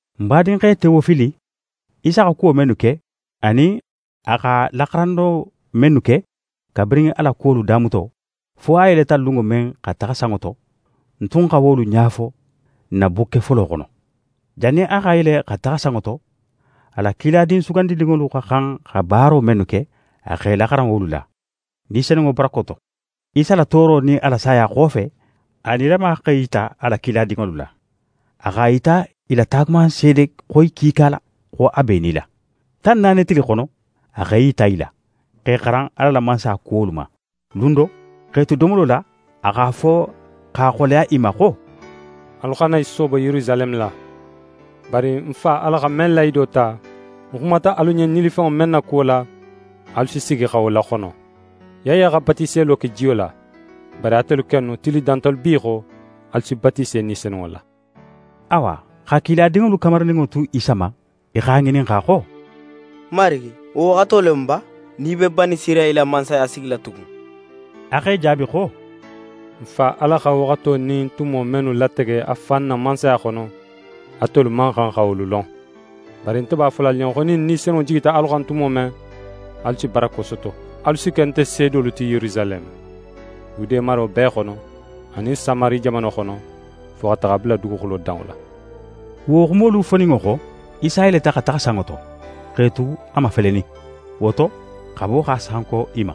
Ń badinxe Tewofili, Isa xa kuwo mennu ke, anin a xa laxaranno mennu ke, kabirin a la kuwolu damuto, fo a yeleta lunŋo men xa taxa sanŋo to, ń tun xa wolu ɲa fo ń na bukke folo xono. Jannin a xa yele xa taxa sanŋo to, a la kiladin sugandininŋolu xa xan xa baaro mennu ke, a x'e laxaran wolu la, Ni Senunŋo barako to. Isa la tooro nin a la saya xofe, a nilama x'é yita a la kiladinŋolu la. A x'a yita i la taagumanseede xoyi kiika la, xo a b'é nila. Tan naani tili xono, a x'é yita i la, x'e xaran Ala la Mansaya kuwolu ma. Lun do, x'e tu domolo la, a x'a fo x'a xoleya i ma xo: «Alu xana i soobo Yerusaleme la, bari ń Fa Ala xa men lahido ta, ń xumata alu ɲen nilifenŋo men na kuwo la, alu si sigi xa wo laxono. Yaya xa batiselo ke jiyo la, bari atelu kennu, tili dantalu bi xo, alu si batise Ni Senunŋo la.» Awa xa kiladinŋolu kamarininŋo tu Isa ma, i x'a ŋininxa xo: «Marigi, wo waxato le mu ba, nin í be Banisirayila mansaya sigila tugun?» A x'e jaabi xo: «Ń Fa Ala xa waxato nin tumo mennu latege a fan na mansaya xono, atelu man xan xa wolu lon. Bari nte b'a fola alu ɲen xo, nin Ni Senunŋo jigita alu xan tumo men, alu si barako soto. Alu si ke nte seedolu ti Yerusaleme, Yude maro bee xono, anin Samari jamano xono, fo xa taxa a bula duguxulo danŋo la.» Wo xumolu foninŋo xo, Isa yeleta xa taxa sanŋo to, x'e tu a mafelenin. Wo to, xabo x'a sanko i ma.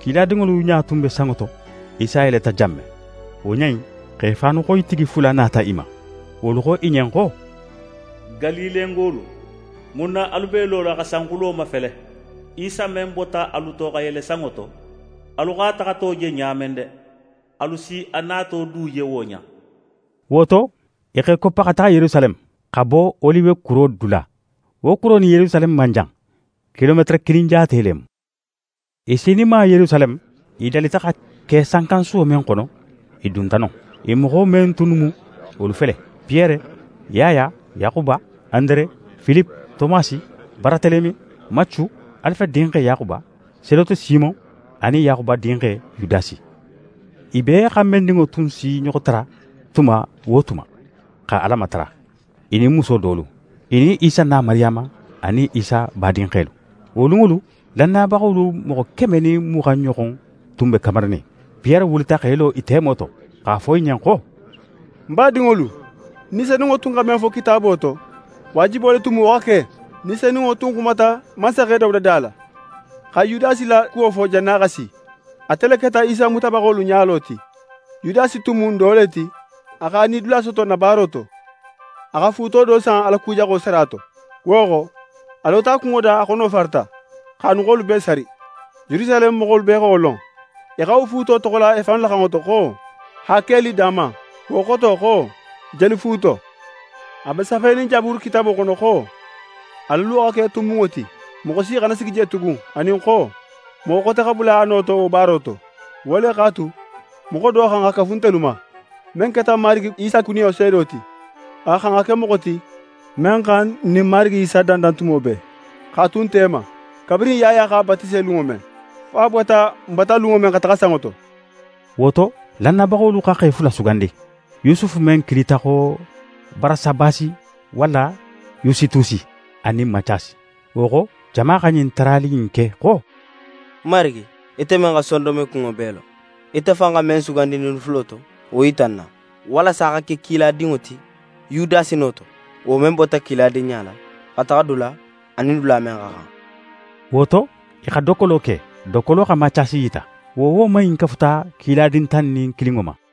Kiladinŋolu ɲa tun be sanŋo to, Isa yeleta jan men. Wo ɲa in, xe faanuxoyitigi fula nata i ma. Wolu xo i ɲen xo: «Galilengolu, mun na alu b'e lola xa sanxulo mafele? Isa men bota alu to xa yele sanŋo to, alu x'a taxato je ɲa men de, alu si a nato du je wo ɲa in.» Wo to, i x'e koppa xa taxa Yerusaleme, xa bo Oliwe kuro dula. Wo kuro nin Yerusaleme man jan; kilometere kilin jaate le mu. I sininma Yerusaleme, i dalita xa ke sankansuwo men xono, i dunta non. I moxo men tunnu mu, wolu fele: Piyere, Yaya, Yaxuba, Andere, Filipe, Tomasi, Baratelemi, Macu, Alife dinxe Yaxuba, Seloti Simon anin Yaxuba dinxe Yudasi. I bee xanbenninŋo tun s'i ɲoxo tara tuma wo tuma, xa Ala matara, i nin muso dolu, i nin Isa na Mariyama, anin Isa badinxelu. Wo lunŋolu, lannayabaxolu moxo keme nin muxan ɲoxon tun be kamarinin. Piyere wulita x'é lo i temo to, x'a fo i ɲen xo: «Ń badinŋolu, Ni Senunŋo tun xa men fo Kitaabo to, waajibo le tun mu wo xa ke. Ni Senunŋo tun xumata mansaxe Dawuda da la, xa Yudasi la kuwo fo, jannin a xa si. Ate le keta Isa mutabaxolu ɲalo ti. Yudasi tun mu n do le ti, a x'a nidula soto n na baaro to. A xa fuuto do san a la ku jaxo sara to. Wo xo, a lota a kunŋo da, a xono farata, x'a nuxolu bee sari. Yerusaleme moxolu bee xa wo lon. I xa wo fuuto toxola i fannu la xanŋo to xo “Hakelidama”. Wo xoto xo: “Jelu fuuto”. A be safenin Jaburu kitaabo xono xo: “A la luwo xa ke tunbunŋo ti. Moxo si xana sigi je tugun.” Anin xo: “Moxo xote xa bula a no to wo baaro to.” Wo le x'a tu, moxo do xa xan xa kafu ntelu ma, men keta Marigi Isa kuniyo seedo ti. A xa xan xa ke moxo ti, men xa n nin Marigi Isa dandan tumo bee, x'a tu n tema, kabirin Yaya x'a batise lunŋo men, fo a bota n bata lunŋo men xa taxa sanŋo to.» Wo to, lannayabaxolu xa xe fula sugandi: Yusufu men kilita xo Barasabasi walla Yusitusi, a nin Macasi. Wo xo, jama xa ɲin tarali in ke xo: «Marigi, ite men xa sondonmekunŋo bee lon, ite fan xa men sugandi ɲinnu fulo to, wo yita n na, walasa a xa ke kiladinŋo ti Yudasi no to, wo men bota kiladinɲa la, xa taxa dula, a nin dula men xa xan.» Wo to, i xa dokkolo ke, dokkolo xa Macasi yita. Wo woman in kafuta kiladin tan nin kilinŋo ma.